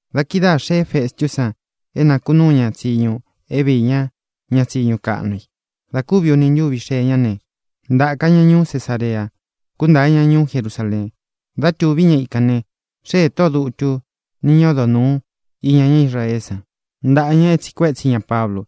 Da kidáā xeé Festú san é nākunúu ña tsiñu é viī ñá ña tsiñu kaꞌnu i. Dā kúvi uni ntúvi xee ñá ne, ntāka ña ñuú Cesarea, kuntáa ña ñuú Jerusaleen. Dá tūví ña ikān ne, xéē tóꞌō dutu ni ñá odo nūu iña ñá Israeé san ntaꞌa ña e tsiꞌi kuétsi ña Pablu.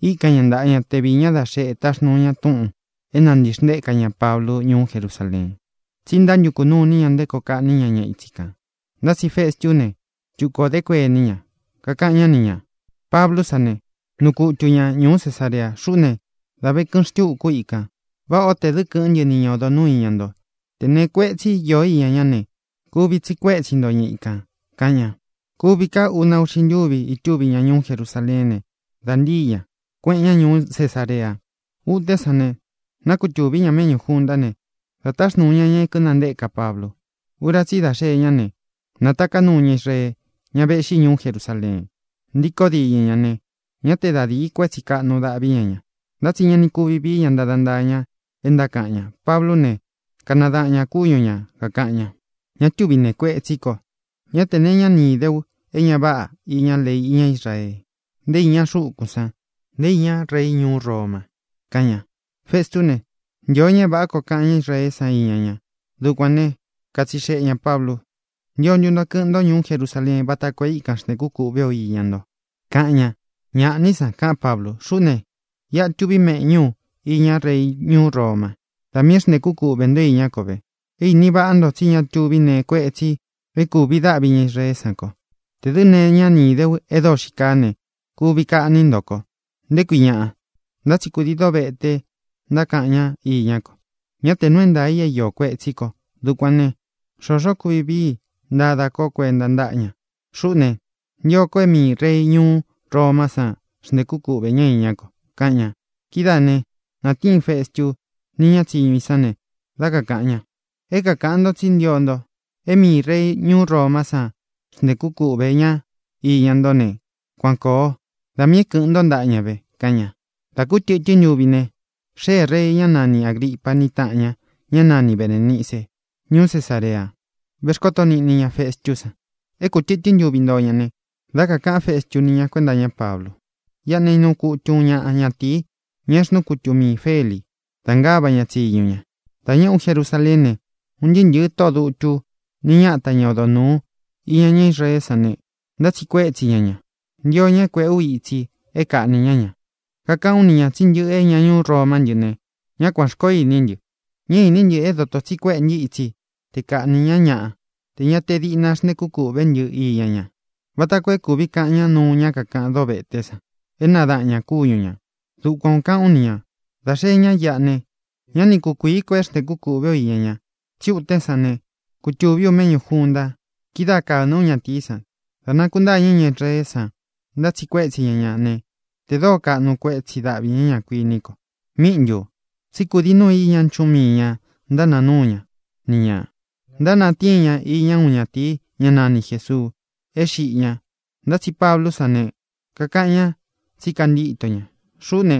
Íkan ña ntaꞌa ña te viī ñá da xeꞌe taxnūu ña túꞌūn é nāntixntéka ña Pablu ñuú Jerusaleen. Tsí ntántukū nuu iní ña nté koo kaꞌní ña ña ítsi kān. Ntá tsi Festú ne, tuku ō dé kuení ña. Kakaꞌan ñá ni ñā: —Pablú sa ne, nuu kutu ña ñūú Cesarea. Xuꞌú ne, dā ve kɨꞌɨn xtúkū ú ikān. Váꞌā ó tē dɨ́ kɨ̄ꞌɨ́n ntɨ ni ña odo nūú iña nto. Tē neé kuetsi ío iña ñá ne, kuvi tsiꞌi kuétsi nto ña ikān —kaꞌan ña. Kūvi ka úna uꞌxi ntúvi itúvi ña ñuú Jerusaleén ne, dā ntíi ña, kueꞌen ña ñuú Cesarea. Utén san ne, nákutūví ña meꞌñú juntá ne, dā táxnūu ña ña é kīnantéka Pablu. Ura tsí i dá xee ñá ne, nātaká nuu ña Israee, ña véꞌxi ñuú Jerusaleen, ntíkō diñɨ ña ne, ñá te da dīí kuetsi kaꞌnu dáꞌvi ña ña. Ntá tsi ña ni kuvi vií ña ntada ntaa ña é ntákaꞌan ña. Pablú ne, kanadaꞌan ñā kúñu ña, kakāꞌan ña: —Ña túvi nēe kuetsí ko. Ñá tē nee iñá ni īde ú e ña váꞌa iña lei ñá Israee, nté iña xukun san, nté iña rei ñuú Roma —kaꞌan ña. Festú ne, ntīo ña é vāꞌá koo kaꞌan ñá Israeé san iña ña. Dukuān né, katsixeꞌe ñā Pablu: —¿Ntío ntu nto kɨꞌɨn ntó ñuú Jerusaleen váta koo é ikan xntēkú kūꞌvé u iña nto? —kaꞌan ña. —Ñāꞌá ni san —kaꞌán Pablu—. Xuꞌú ne, iꞌa tuví u méꞌñū junta iña rei ñuú Roma. Da miī é xntēkú kuꞌvē ntó iñá ko ve. É īni váꞌa nto tsí ña tuví nee kuetsi é kūvi dáꞌvi ña Israeé san ko. Tē dɨ́ nee iñá ni īde ú e dóo xii kaá ne, kuvi kaꞌní nto ko, ¿nté kui ñaꞌa? Ntá tsi kūdií dovete ntákaꞌan ñá iñá ko. Ñá te nuu é ntaā i é īó kuetsī ko. Dukuān né, xōxó kuvi vii i ntadá ko kuenta ntáꞌa ña. Xuꞌú ne, ntio ko é miī rei ñuú Romá san xntēkú kuꞌvē ñá iñá ko —kaꞌan ña. Kidáā ne, natíin Festu ni ñá tsiñu i san ne, dá kakāꞌan ña: —É kākaꞌan ntó tsí ntio nto é miī rei ñuú Romá san xntēkú kuꞌvē ñá iña ntó ne, kuan kōo. Da miī é kɨ̄ꞌɨn ntó ntaꞌa ña ve —kaꞌan ña. Dā kú tɨtɨ́n ntuvi ne, xéē rei, ñá nani Āgripa ni táꞌan ña, ñá nani Berēnice, ñuú Cesarea, vexkóto niꞌni ña Festú san. É ku tɨ̄tɨ́n ntuvi ntóo ña ne, dá kakāꞌán Festu ni ña kuénta iñá Pablu: —Iꞌa ne, nuu kutu uun ñaꞌa ñatīi, ña é xnuu kutu miī Feli da ngáva ña tsiñu ña. Dā ñéꞌē ú Jerusaleén ne, un ntɨɨ́ ntɨ̄ɨ tóꞌō dutu nī ñáta ña odo nūu iña ñá Israeé san ne, ntátsiꞌi kuétsi ña ña. Ntio ña é kuēꞌé u itsi é kaꞌnī ñá ña. Kakaꞌán u ni ñā tsí ntɨꞌɨ é ña ñuú Romá ntɨ ne, ñá kuān xkoó iní ntɨ. Ñá īní ntɨ é dotō tsi kuéꞌē ntɨ́ itsi te kaꞌnī ñá ñaꞌa tē ña diꞌna xntēkú kūꞌvé ntɨ iña ña, vata koo é kūvi kaꞌan ñá nuu ñá kakaꞌan véte san é nadaꞌan ñā kúñu ñā. Dukuan ō kaꞌán u ni ñā. Dā xee ñá iꞌa ne, ñá ni kukuīí ko é xntēkú kūꞌvé u iña ña. Tsí utén san ne, kutūví u méꞌñū junta. Kidáā kána ú ñatīí san. Dā nakuntáñɨ ña Israeé san, ntátsiꞌi kuétsi ña ña ne, tē dóo kaꞌnu kuétsi daꞌví ña ña, kuiní ko. ¿Míꞌi ntū? Tsí kūdii núu i īñá nchuꞌún mii ñā ntánāa núu ña ni ñā: Ntánatíin ña iña uun ñátīí, ña nani Jēsuu. E xíꞌi ñā, ntá tsi Pablú san ne, kakaꞌan ñá tsi kantíto ña. Xuꞌú ne,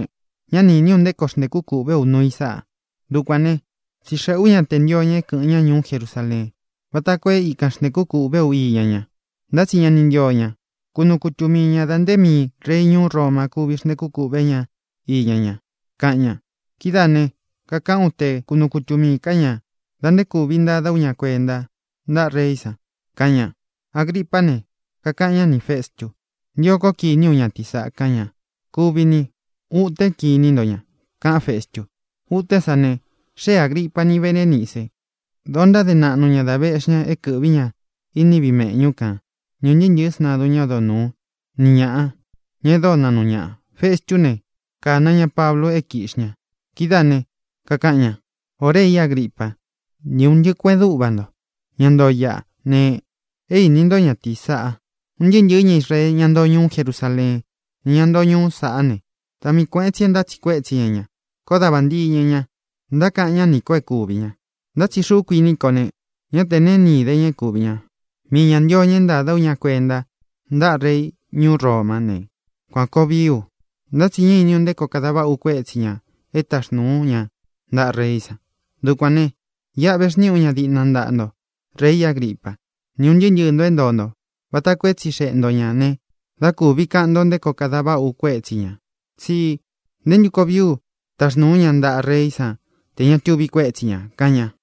ñá ni īní u nté koo xntēkú kūꞌvé u nuu i sáꞌa. Dukuān né, tsixeꞌē ú ña te ntio ña é kɨ̄ꞌɨn ñá ñuú Jerusaleen váta koo e íkan xntēkú kūꞌvé u iña ña. Ntá tsi ña ni ntío ña. Kunuu kutu mii ña dā nté miī rei ñuú Roma kúvi xntēkú kuꞌvē ñá iña ñá, kaꞌan ña. Kidáā ne, kakaꞌán u te kunuu kutu miī ká ña da nté kūvi ntada ú ña kuenta ntáꞌa reí san —kaꞌan ña. Agripá ne, kakaꞌan ñá nī Festu: —Ntio kó kiní u ñatīí saꞌa —kaꞌan ña. —Kuvi ni. Utén kiní nto ña —kaꞌán Festu. Utén san ne, xée Āgripa ni Berénice. Dōo ntáde naꞌnu ñā dá vēꞌxí ña é kɨ̄ꞌví ña iní viꞌi mēꞌñú kan ni ūn ntɨɨ́ ntɨ̄ɨ́ sntadun ñá odo nūú, ni ñāꞌa, ña e dóo naꞌnu ñaꞌa. Festú ne, kāna ña Pablu é kīꞌxi ña. Kidáā ne, kakaꞌan ña: —Ō rei Agripa, ni un ntɨꞌɨ kueꞌen dúꞌva nto, ña ntoo iꞌa ne: é īni ntó ñatīí saꞌa. Un ntɨɨ́ ntɨ̄ɨ́ ña Israee, ñá ntoo ñuú Jerusaleen, ni ñá ntoo ñuú saꞌá ne, da mii kuēꞌen tsi é ntátsiꞌi kuétsi ña ña. Koó da vāntiñɨ ña, ntákaꞌan ñá nī kó é kūvi ña. Ntá tsi xuꞌú kuiní ko ne, ñá te neé ni īde ña é kūvi ña. Mii ñā ntio ña é ntāda ú ña kuenta ntáꞌa rei ñuú Romá ne, kuān koo vií u. Ntá tsi ñá īní u nté koo kada váꞌa u kuétsi ñā é taxnūu ú ña ntaꞌa reí san. Dukuān ne, iꞌa vexniꞌi ú ña diꞌna ntaꞌa nto, rei Agripa, ni ún ntɨɨ́ ntɨɨ̄ ntó é ntoo nto, vata koo é tsixeꞌe nto ñā ne, dá kūvi kaꞌan ntó nté koo kada váꞌa u kuétsi ñā. Tsí ¿ntē ntú koo vií u taxnūu ú ña ntaꞌa reí san tē ña tuvi kuétsi ñā? —kaꞌan ña.